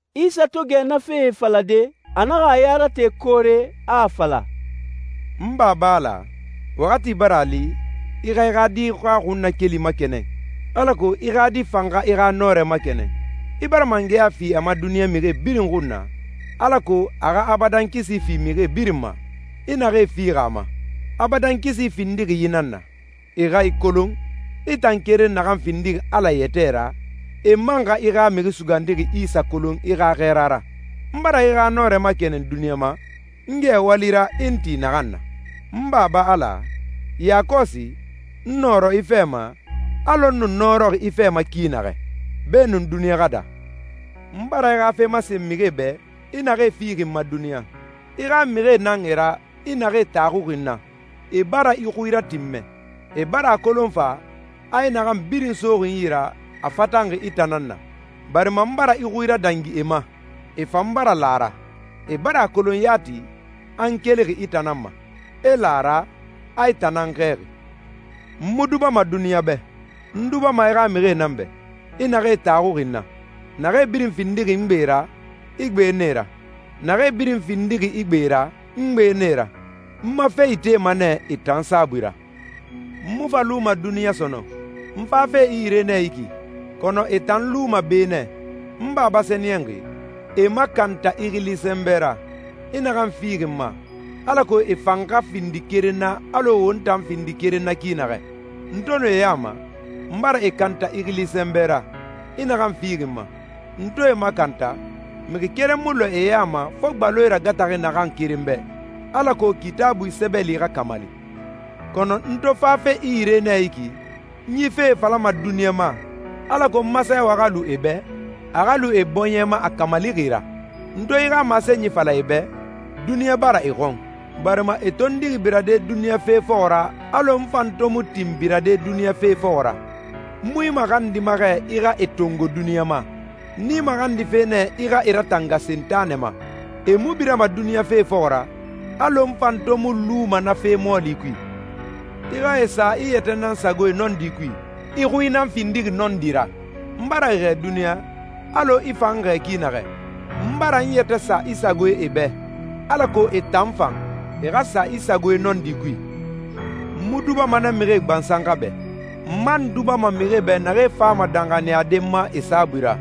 Isa to gɛ na fee falade, a naxa a ya rate koore, a a fala, «N Baba Ala, waxati bara a li. I xa i xa Di xa xunnakeli makɛnɛn, alako i xa Di fan xa i xa nɔrɛ makɛnɛn. I bara mangɛya fi a ma duniɲa mixie birin xun na, alako a xa abadan kisi fi mixi birin ma, i naxee fixi a ma. Abadan kisi findixi yi nan na: E xa i kolon, i tan keren naxan findixi Ala yɛtɛ ra, e man xa i xa Mixi Sugandixi Isa kolon i xa xɛɛra ra. N bara i xa nɔrɛ makɛnɛn duniɲa ma, n gɛ wali ra i n ti naxan na. N Baba Ala, yakɔsi, n nɔrɔ i fɛ ma, alɔ n nu nɔrɔxi i fɛ ma ki naxɛ, beenun duniɲa xa daa.» «N bara i xa fe masen mixie bɛ, i naxee fixi n ma duniɲa. I xa mixie nan e ra i naxee taxuxi n na. E bara i xui ratinmɛ. E bara a kolon fa, a i naxan birin soxi n yi ra, a fatanxi i tan nan na, barima n bara i xui radangi e ma, e fan bara la a ra. E bara a kolon yati, a n kelixi i tan nan ma, e la a ra, a i tan nan n xɛɛxi. N mu dubama duniɲa bɛ. N dubama i xa mixie nan bɛ, i naxee taxuxi n na. Naxee birin findixi n gbe ra, i gbe na e ra. Naxee birin findixi i gbe ra, n gbe na e ra. N ma fe itema nɛ e tan saabui ra. N mu fa luma duniɲa sɔnɔn. N fafe i yire nɛ yi ki, kɔnɔ e tan luma be nɛ. N Baba Sɛniyɛnxi, e makanta i xili sɛnbɛ ra, i naxan fixi n ma, alako e fan xa findi keren na alɔ won tan findixi keren na ki naxɛ. N to nu e ya ma, n bara e kanta i xili sɛnbɛ ra, i naxan fixi n ma. N to e makanta, mixi keren mu lɔɛ e ya ma fo gbaloe ragataxi naxan keren bɛ, alako Kitaabui sɛbɛli xa kamali. Kɔnɔ n to fafe i yire nɛ yi ki, n yi fee falama duniɲa ma, alako n ma sɛɛwɛ xa lu e bɛ, a xa lu e bɔɲɛ ma a kamalixi ra. N to i xa masenyi fala e bɛ, duniɲa bara e xɔn, barima e tondixi birade duniɲa fe fɔxɔ ra alɔ n fan to mu tinxi birade duniɲa fe fɔxɔ ra. N mu i maxandima xɛ i xa e tongo duniɲa ma. N i maxandife nɛ i xa e ratanga Sentanɛ ma. E mu birama duniɲa fe fɔxɔ ra, alɔ n fan to mu luma na fe mɔɔli kui. I xa e sa i yɛtɛ nan sagoe nɔndi kui. I xui nan findixi nɔndi ra. N bara e xɛɛ duniɲa, alɔ i fan n xɛɛ ki naxɛ. N bara n yɛtɛ sa i sagoe e bɛ, alako e tan fan, e xa sa i sagoe nɔndi kui.» «N mu dubama na mixie gbansan xa bɛ. N man dubama mixie bɛ naxee fama danxaniyade n ma e saabui ra.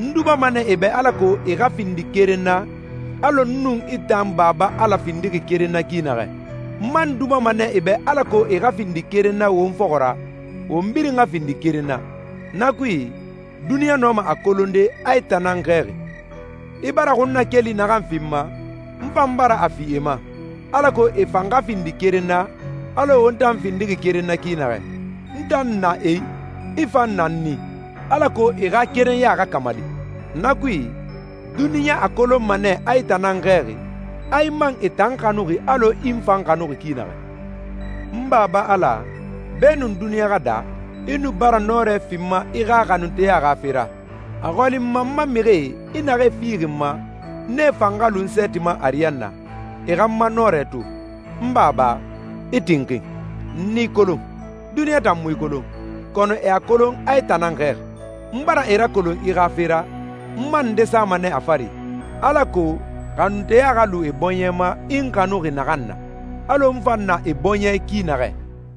N dubama nɛ e bɛ alako e xa findi keren na, alɔ n nun i tan n Baba Ala findixi keren na ki naxɛ. N man dubama e bɛ alako e xa findi keren na won fɔxɔ ra, won birin xa findi keren na. Na kui, duniɲa nɔma a kolonde a i tan nan n xɛɛxi. I bara xunnakeli naxan fi n ma, n fan bara a fi e ma, alako e fan xa findi keren na, alɔ won tan findixi keren na ki naxɛ. N tan na e i, i fan na n i, alako e xa kerenɲa xa kamali. Na kui, duniɲa a kolonma nɛ a i tan nan n xɛɛxi, a i man e tan xanuxi alɔ i n fan xanuxi ki naxɛ.» «N Baba Ala, beenun duniɲa xa daa, i nu bara nɔrɛ fi n ma i xa xanunteya xa fe ra. A xɔli n ma n ma mixie, i naxee fixi n ma, nee fan xa lu n sɛɛti ma ariyanna, e xa n ma nɔrɛ to. N Baba, i tinxin. N i kolon. Duniɲa tan mu i kolon, kɔnɔ e a kolon a i tan nan n xɛɛxi. N bara e rakolon i xa fe ra, n man nde sama nɛ a fari, alako xanunteya xa lu e bɔɲɛ ma i n xanuxi naxan na, alɔ n fan na e bɔɲɛ i ki naxɛ.»